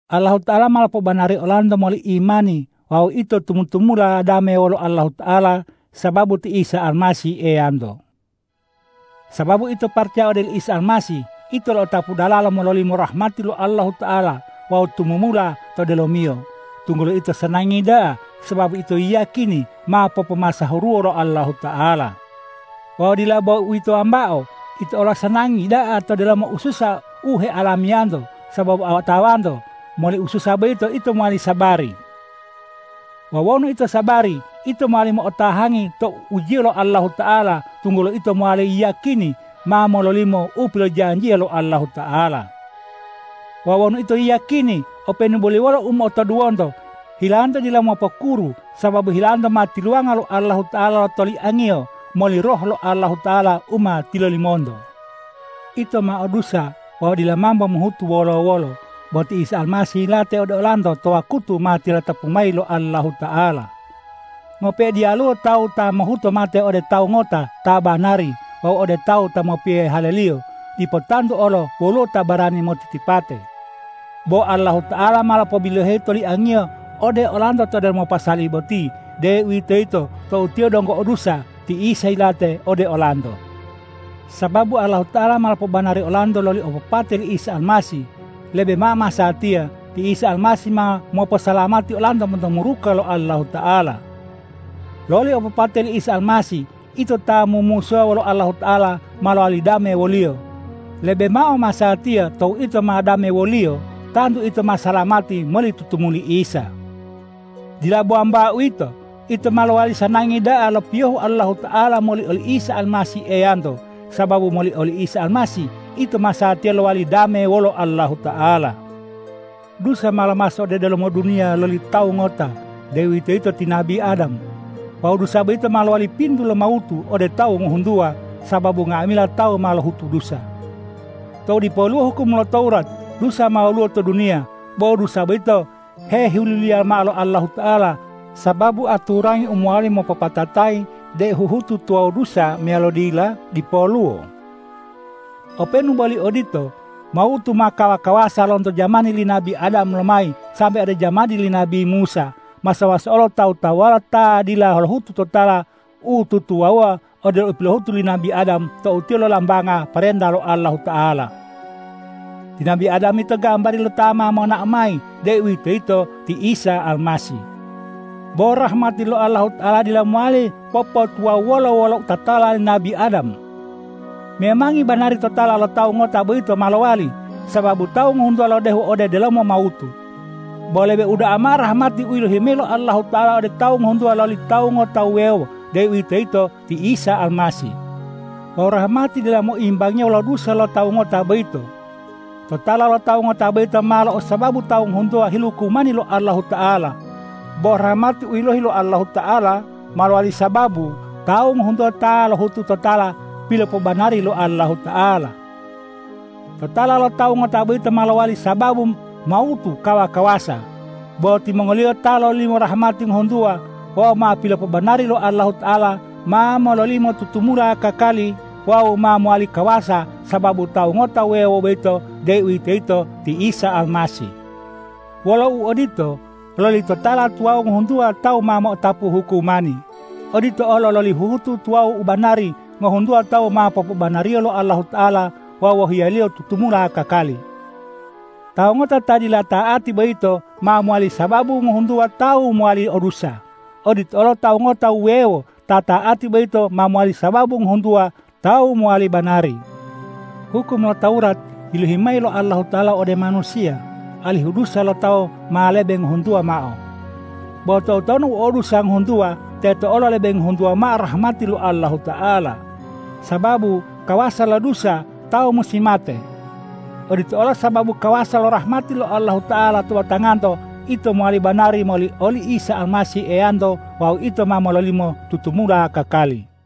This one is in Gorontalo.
Allahuta'ala ma lopobanari olanto moli imani wawu ito tumu-tumula dame wolo Allahuta'ala sababu ti Isa Almasih Eyanto. Sababu ito paracaya ode oli Isa Almasih, ito lo'otapu dalalo mololimo rahmati lo Allahuta'ala wawu tumumula to delomiyo, tunggulo ito sanangi da'a sababu ito yiyakini ma popomasahuruwo lo Allahuta'ala. Wawu dila bo uwito wambao, ito olo sanangi da'a to delomo ususa u heoalamiyanto, sababu otawanto moli ususa boyito ito mowali sabari. Wawu wonu ito sabari, ito mowali mo'otahangi tou ujiyo lo Allahuta'ala, tunggulo ito mowali yiyakini ma mololimo u pilojanjiya lo Allahuta'ala. Wawu wonu ito yiyakini, openu boli wolo u motoduwonto, hilanto dila mopukuru sababu hilanto ma tiluwanga lo Allahuta'ala lo toliangiyo moli Roh lo Allahuta'ala u ma tilolimonto. Ito ma o dusa wawu dila mambo mohutu wolo-wolo, bo ti Isa Almasih yilate ode olanto to wakutu ma tilatapu mayi lo Allahuta'ala. Ngope'e diyaluwo tawu ta mohuto mate ode tawu ngota ta banari wawu ode tawu ta mopiyohe haleliyo, dipo tantu olo woluwo ta barani motitipate. Bo Allahuta'ala ma lopobiloheyi lo toliang-Iyo ode olanto to delomo pasali boti, deuwitoyito tou ito donggo o dusa, ti Isa yilate ode olanto. Sababu Allahuta'ala ma lopobanari olanto loli opopate li Isa Almasih, lebe mao masatiya ti Isa Almasih ma moposalamati olanto monto muruka lo Allahuta'ala. Loli opopate li Isa Almasih, ito ta mumusuwa wolo Allahuta'ala, ma lowali dame wo-Liyo. Lebe mao masatiya tou ito ma dame wo-Liyo, tantu ito ma salamati moli tutumuli Isa. Dila bo wambao uwito. Ito olo mowali sanangi da'a lo piyohu Allahuta'ala moli oli Isa Almasih Eyanto, sababu moli oli Isa Almasih, ito masatiya lowali dame wolo Allahuta'ala. Dusa ma lomaso ode delomo duniya loli tawu ngota, deuwitoyito ti nabi Adam. Wawu dusa boyito ma lowali pintu lo mawutu ode tawu ngohuntuwa, sababu nga'amila tawu ma lohutu dusa. Tou dipoluwo hukum lo Tawurat, dusa ma woluwo to duniya. Bo dusa boyito hehiluliya mao lo Allahuta'ala, sababu aturangi u mowali mopopatatayi deu huhutu tuwawu dusa meyalo dila dipoluwo. Openu boli odito, mawutu ma kawa-kawasa lonto jamani li nabi Adam lomayi sambe ode jamani li nabi Musa, maso-maso olo tawu-tawuwala ta dila lohutu totala u tutuwawuwa odelo u pilohutu li nabi Adam tou tiyo lolambanga parenta lo Allahuta'ala. Ti nabi Adam yito gambari lo ta ma monao mayi, deuwitoyito ti Isa Almasih. Bo rahmati lo Allahuta'ala dila mowali popotuwawuwola wolo totala li nabi Adam. Memangi banari totala lo tawu ngota boyito ma lowali, sababu tawu ngohuntuwa lodehu ode delomo mawutu. Bo lebe uda'a mao rahmati u yilohi lo Allahuta'ala ode tawu ngohuntuwa loli Tawu ngota wuwewo, deuwitoyito ti Isa Almasih. Wawu rahmati dila moimbangiya wolo dusa lo tawu ngota boyito. Totala lo tawu ngota boyito ma lo'osababu tawu ngohuntuwa hilukumani lo Allahuta'ala. Bo rahmati u yilohi lo Allahuta'ala, ma lowali sababu tawu ngohuntuwa ta ma lohutu totala pilopobanari lo Allahuta'ala. Totala lo tawu ngota boyito ma lowali sababu mawutu kawa-kawasa. Bo timongoliyo ta lololimo rahmati ngohuntuwa wawu ma pilopobanari lo Allahuta'ala, ma mololimo tumumula kakali wawu ma mowali kawasa sababu Tawu ngota wuwewo boyito, deuwitoyito ti Isa Almasih. Wolo uodito, loli totala tuwawu ngohuntuwa tawu ma mo'otapu hukumani. Odito olo loli huhutu tuwawu u banari, ngohuntuwa tawu ma popobanariyo lo Allahuta'ala wawu wohiya-Liyo tutumula kakali. Tawu ngota ta dila ta'ati boyito ma mowali sababu ngohuntuwa tawu mowali o dusa. Odito olo Tawu ngota wuwewo ta ta'ati boyito ma mowali sababu ngohuntuwa tawu mowali banari. Hukum lo Tawurat yilohi mayi lo Allahuta'ala ode manusiya, alihu dusa lo tawu ma lebe hengohuntuwa mao. Bo toutonu u o dusa ngohuntuwa, teto olo lebe ngohuntuwa mao rahmati lo Allahuta'ala. Sababu kawasa lo dusa, tawu musi mate. Odito olo sababu kawasa lo rahmati lo Allahuta'ala to batanganto, ito mowali banari moli oli Isa Almasih Eyanto wawu ito ma mololimo tutumula kakali.